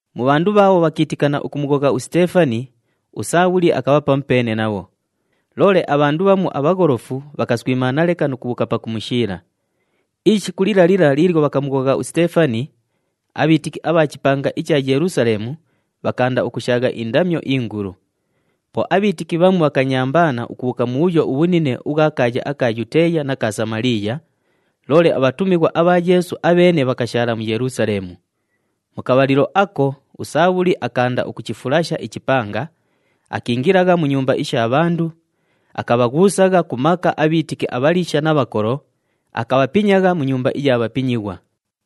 Mu bhandu bhaabho bhakiitikana ukumughogha uSiteefani, uSaabhuli akabha pamupeene nabho. Loole abhandu bhamu abhagholofu bhakaswimaana leka nu kubhuuka pakumushiila. Ishiku lila lila liilyo bhakamughogha uSiteefani, abhiitiki abha chipanga icha Yelusaleemu bhakaanda ukushaagha indamyo ingulu. Po abhiitiki bhamu bhakanyambaana ukubhuuka mubhuyo ubhunine ubhwa kaaya aka Yuteeya na ka Samaliiya, loole abhatumighwa abha Yeesu abheene bhakashaala mu Yelusaleemu. Mu kabhalilo ako uSaabhuli akaanda ukuchifulasha ichipanga, akiingilagha mu nyumba isha bhandu, akabhaghuusagha ku maka abhiitiki abhaliisha na bhakolo, akabhapinyagha mu nyumba iya bhapinyighwa.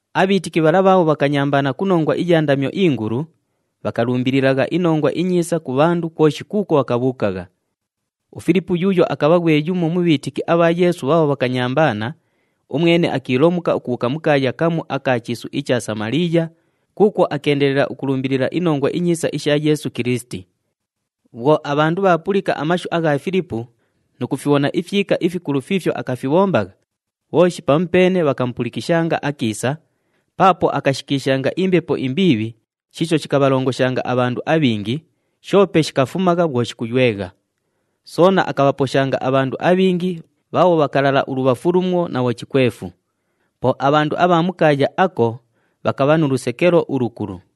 Abhiitiki bhala bhaabho bhakanyambaana ku nongwa iya ndamyo ingulu, bhakalumbililagha iNongwa iNyiisa ku bhandu kwoshi kuukwo bhakabhuukagha. UFilipu yuuyo akabha ghwe yumo mu bhiitiki abha Yeesu bhaabho bhakanyambaana, umwene akiilomuka ukubhuuka mu kaaya kamu aka chiisu icha Samaliiya kuukwo akeendelela ukulumbilila iNongwa iNyiisa isha Yeesu Kilisiti. Bhwo abhandu bhaapulika amashu agha Filipu nu kufibhona ifyika ifikulu fiifyo akafibhombagha, bhooshi pamupeene bhakamupulikishanga akiisa, paapo akashikiishanga imbepo imbiibhi shiisho shikabhalongoshanga abhandu abhingi, shoope shikafumagha bhwo shikuywegha. Soona akabhaposhanga abhandu abhingi bhaabho bhakalala ulubhafu lumo na bhochikwefu. Po abhandu abha mu kaaya ako bhakabha nu lusekelo ulukulu.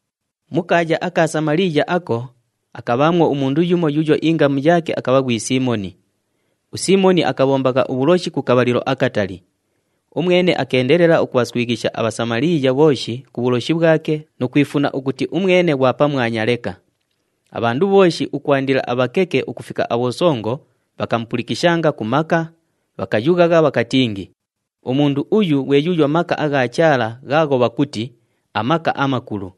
Mu kaaya aka Samaliiya ako, akabhaamwo umundu yumo yuuyo ingamu yaake akabha ghwi Siimoni. USiimoni akabhombagha ubhuloshi ku kabhalilo akatali. Umwene akeendelela ukubhaswighisha aBhasamaliiya bhooshi ku bhuloshi bhwake nu kwifuna ukuti umwene ghwa pamwanya leka. Abhandu bhooshi ukwandila abhakeke ukufika abhosongo bhakamupulikishanga ku maka, bhakayughagha bhakatingi, “Umundu uyu ghwe yuuyo maka agha Chaala ghaagho bhakuti, ‘AMaka aMakulu.’”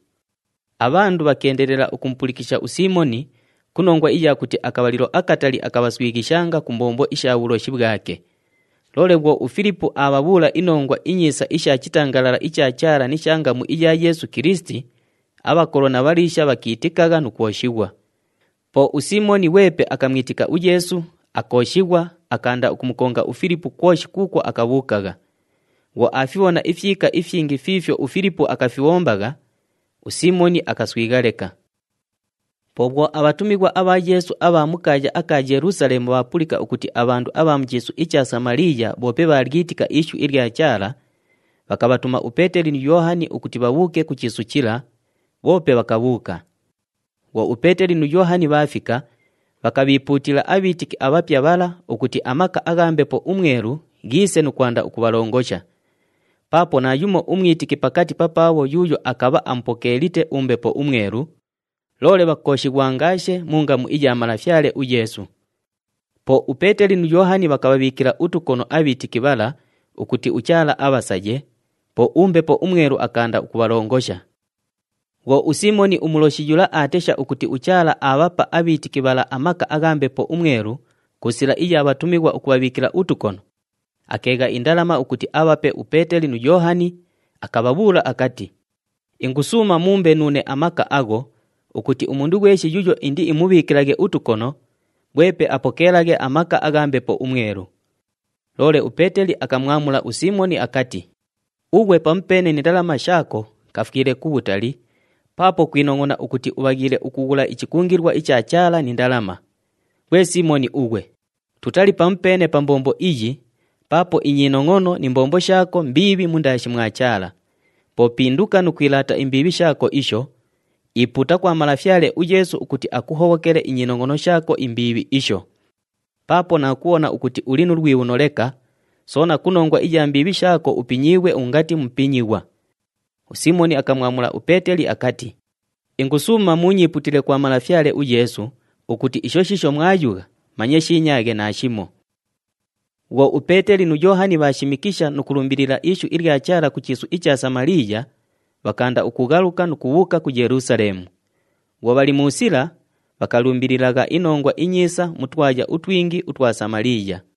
Abhandu bhakeendelela ukumupulikisha uSiimoni ku nongwa iya kuti akabhalilo akatali akabhaswighishanga ku mbombo isha bhuloshi bhwake. Loole bhwo uFilipu aabhabhuula iNongwa iNyiisa isha chitangalala icha Chaala ni sha ngamu iya Yeesu Kilisiti, abhakolo na bhaliisha bhakiitikagha nu kwoshighwa. Po uSiimoni ghwepe akamwitika uYeesu, akooshighwa, akaanda ukumukonga uFilipu kwoshi kuukwo akabhuukagha. Bhwo aafibhona ifyika ifyingi fiifyo uFilipu akafibhombagha, uSiimoni akaswigha leka. Po bhwo abhatumighwa abha Yeesu abha mu kaaya aka Yelusaleemu bhaapulika ukuti abhandu abha mu chiisu icha Samaliiya bhoope bhaalyitika ishu ilya Chaala, bhakabhatuma uPeeteli nu Yoohani ukuti bhabhuuke ku chiisu chila, bhoope bhakabhuuka. Bhwo uPeeteli nu Yoohani bhaafika, bhakabhiipuutila abhiitiki abhapya bhala ukuti amaka agha Mbepo uMwelu ghiise nu kwanda ukubhalongosha. Paapo naayumo umwitiki pakati papaabho yuuyo akabha amupokeelite uMbepo uMwelu, loole bhakooshighwangaashe mu ngamu iya Malafyale uYeesu. Po uPeeteli nu Yoohani bhakabhabhiikila utukono abhiitiki bhala ukuti uChaala abhasaye, po uMbepo uMwelu akaanda ukubhalongosha. Bhwo uSiimoni umuloshi yula aatesha ukuti uChaala aabhapa abhiitiki bhala amaka agha Mbepo uMwelu ku sila iya bhatumighwa ukubhabhiikila utukono, akeegha indalama ukuti abhape uPeeteli nu Yoohani, akabhabhuula akati, “Ingusuuma muumbe nuune amaka agho ukuti umundu ghweshi yuuyo indiimubhiikilaghe utukono, ghwepe apokeelaghe amaka agha Mbepo uMwelu.” Loole uPeeteli akamwamula uSiimoni akati, “Ughwe pamupeene ni ndalama shaako kafwile kubhutali paapo kwinongʼona ukuti ubhaghiile ukughula ichikungilwa icha Chaala ni ndalama! Ghwe Siimoni ughwe, tutali pamupeene pa mbombo iyi paapo inyinongʼono ni mbombo shaako mbiibhi mundaashi mwa Chaala. Po pinduka nu kwilaata imbiibhi shaako isho, ipuuta kwa Malafyale uYeesu ukuti akuhobhokele inyinongʼono shaako imbiibhi isho. Paapo naakubhona ukuti uli nu lwibhuno leka, soona ku nongwa iya mbiibhi shaako upinyiighwe ungati mupinyighwa.” USiimoni akamwamula uPeeteli akati, “Ingusuuma muunyiipuutile kwa Malafyale uYeesu ukuti isho shiisho mwayugha manye shiinyaaghe naashimo.” Bhwo uPeeteli nu Yoohani bhaashimikisha nu kulumbilila ishu ilya Chaala ku chiisu icha Samaliiya, bhakaanda ukughaluka nu kubhuuka ku Yelusaleemu. Bhwo bhali mu sila, bhakalumbililagha iNongwa iNyiisa mu twaya utwingi utwa Samaliiya.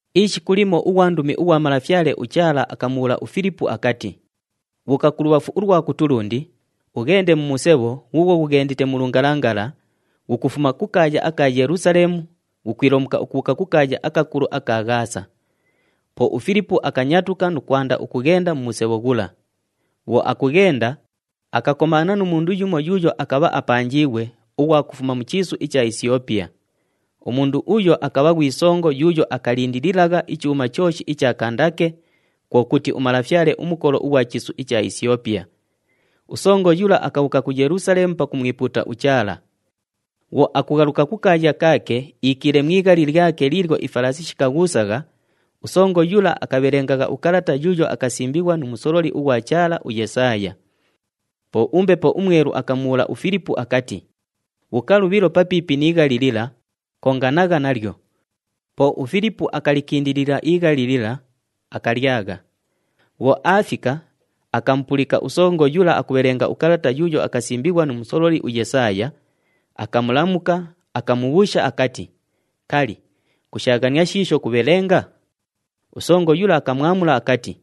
Ishiku limo ughwandumi ughwa Malafyale uChaala akamubhuula uFilipu akati, “Bhuuka kulubhafu ulwa kutulundi, ughende mu musebho ghuughwo ghughendite mu lungalangala, ghukufuma ku kaaya aka Yelusaleemu ghukwilomuka ukubhuuka ku kaaya akakulu aka Ghaasa.” Po uFilipu akanyatuka nu kwanda ukughenda mu musebho ghula. Bhwo akughenda, akakomaana nu mundu yumo yuuyo akabha apanjiighwe ughwa kufuma mu chiisu icha Isyopiya. Umundu uyo akabha ghwi songo yuuyo akalindililagha ichuuma chooshi icha Kandake, kwo kuti, umalafyale umukolo ughwa chiisu icha Isyopiya. Usongo yula akabhuuka ku Yelusaleemu pakumwipuuta uChaala. Bhwo akughaluka kukaaya kaake iikiile mu ighali lyake liilyo ifalaasi shikaghuusagha, usongo yula akabhelengagha ukalata yuuyo akasimbighwa nu musololi ughwa Chaala, uYesaaya. Po uMbepo uMwelu akamubhuula uFilipu akati, “Bhuuka lubhilo papiipi pi ighali lila, konganagha nalyo.” Po uFilipu akalikindilila ighali lila, akalyagha. Bhwo aafika, akamupulika usongo yula akubhelenga ukalata yuuyo akasimbighwa nu musololi uYesaaya, akamulamuka, akamubhuusha akati, “Kali, kushaaghania shiisho kubhelenga?” Usongo yula akamwamula akati,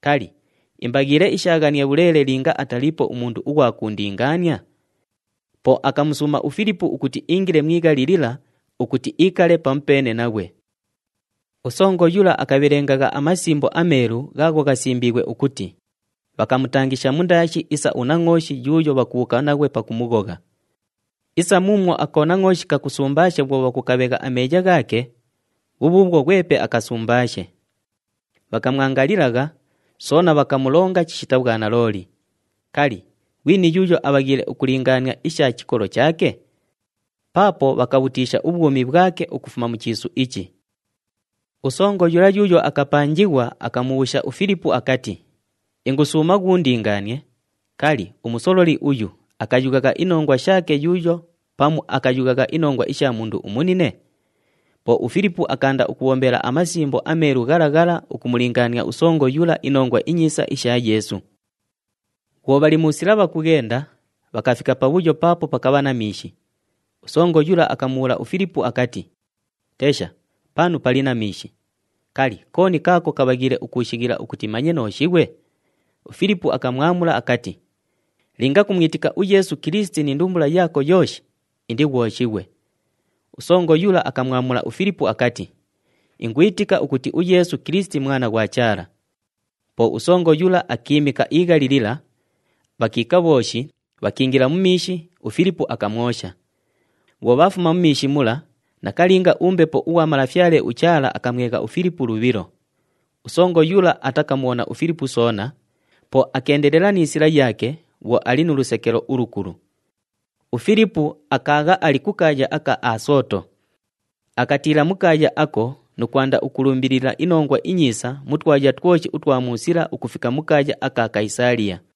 “Kali, imbaghiile ishaaghanie bhuleele linga ataliipo umundu ughwa kuundingaania?” Po akamusuuma uFilipu ukuti iingile mu ighali lila ukuti iikale pamupeene naghwe. Usongo yula akabhelengagha aMasimbo aMeelu ghaagho ghasimbiighwe ukuti, “Bhakamutangisha mundaashi isa unangʼooshi yuuyo bhakubhuuka naghwe pakumughogha. Isa muumwo akonangʼooshi kakusumbaashe bhwo bhakukabhegha ameeya ghaake, bhubhuubhwo ghwepe akasumbaashe. Bhakamwangalilagha, soona bhakamulonga chishita bhwanalooli. Kali, ghwini yuuyo abhaghiile ukulingaania isha chikolo chaake? Paapo bhakabhutiisha ubhwumi bhwake ukufuma mu chiisu ichi.” Usongo yula yuuyo akapanjighwa akamubhuusha uFilipu akati, “Ingusuuma ghuundingaanie, kali, umusololi uyu akayughagha inongwa shaake yuuyo pamu akayughagha inongwa isha mundu umunine?” Po uFilipu akaanda ukubhombela aMasimbo aMeelu ghala ghala ukumulingaania usongo yula iNongwa iNyiisa isha Yeesu. Bhwo bhali mu sila bhakughenda, bhakafika pabhuyo paapo pakabha na miishi. Usongo yula akamubhuula uFilipu akati, “Tesha, panu pali na miishi! Kali, kooni kaako kabhaghiile ukuushighila ukuti manye nooshighwe?” [ UFilipu akamwamula akati, “Linga kumwitika uYeesu Kilisiti ni ndumbula yaako yooshi, indighwoshighwe.” Usongo yula akamwamula uFilipu akati, “Ingwitika ukuti uYeesu Kilisiti Mwana ghwa Chaala.”] Po usongo yula akiimika ighali lila, bhakiika bhooshi, bhakiingila mu miishi, uFilipu akamwosha. Bhwo bhaafuma mu miishi mula, nakalinga uMbepo ughwa Malafyale uChaala akamwegha uFilipu lubhilo. Usongo yula atakamubhona uFilipu soona, po akeendelela ni sila yaake bhwo ali nu lusekelo ulukulu. UFilipu akaagha ali ku kaaya aka Asooto. Akatiila mu kaaya ako nu kwanda ukulumbilila iNongwa iNyiisa mu twaya twoshi utwa mu sila ukufika mu kaaya aka Kayisaaliya.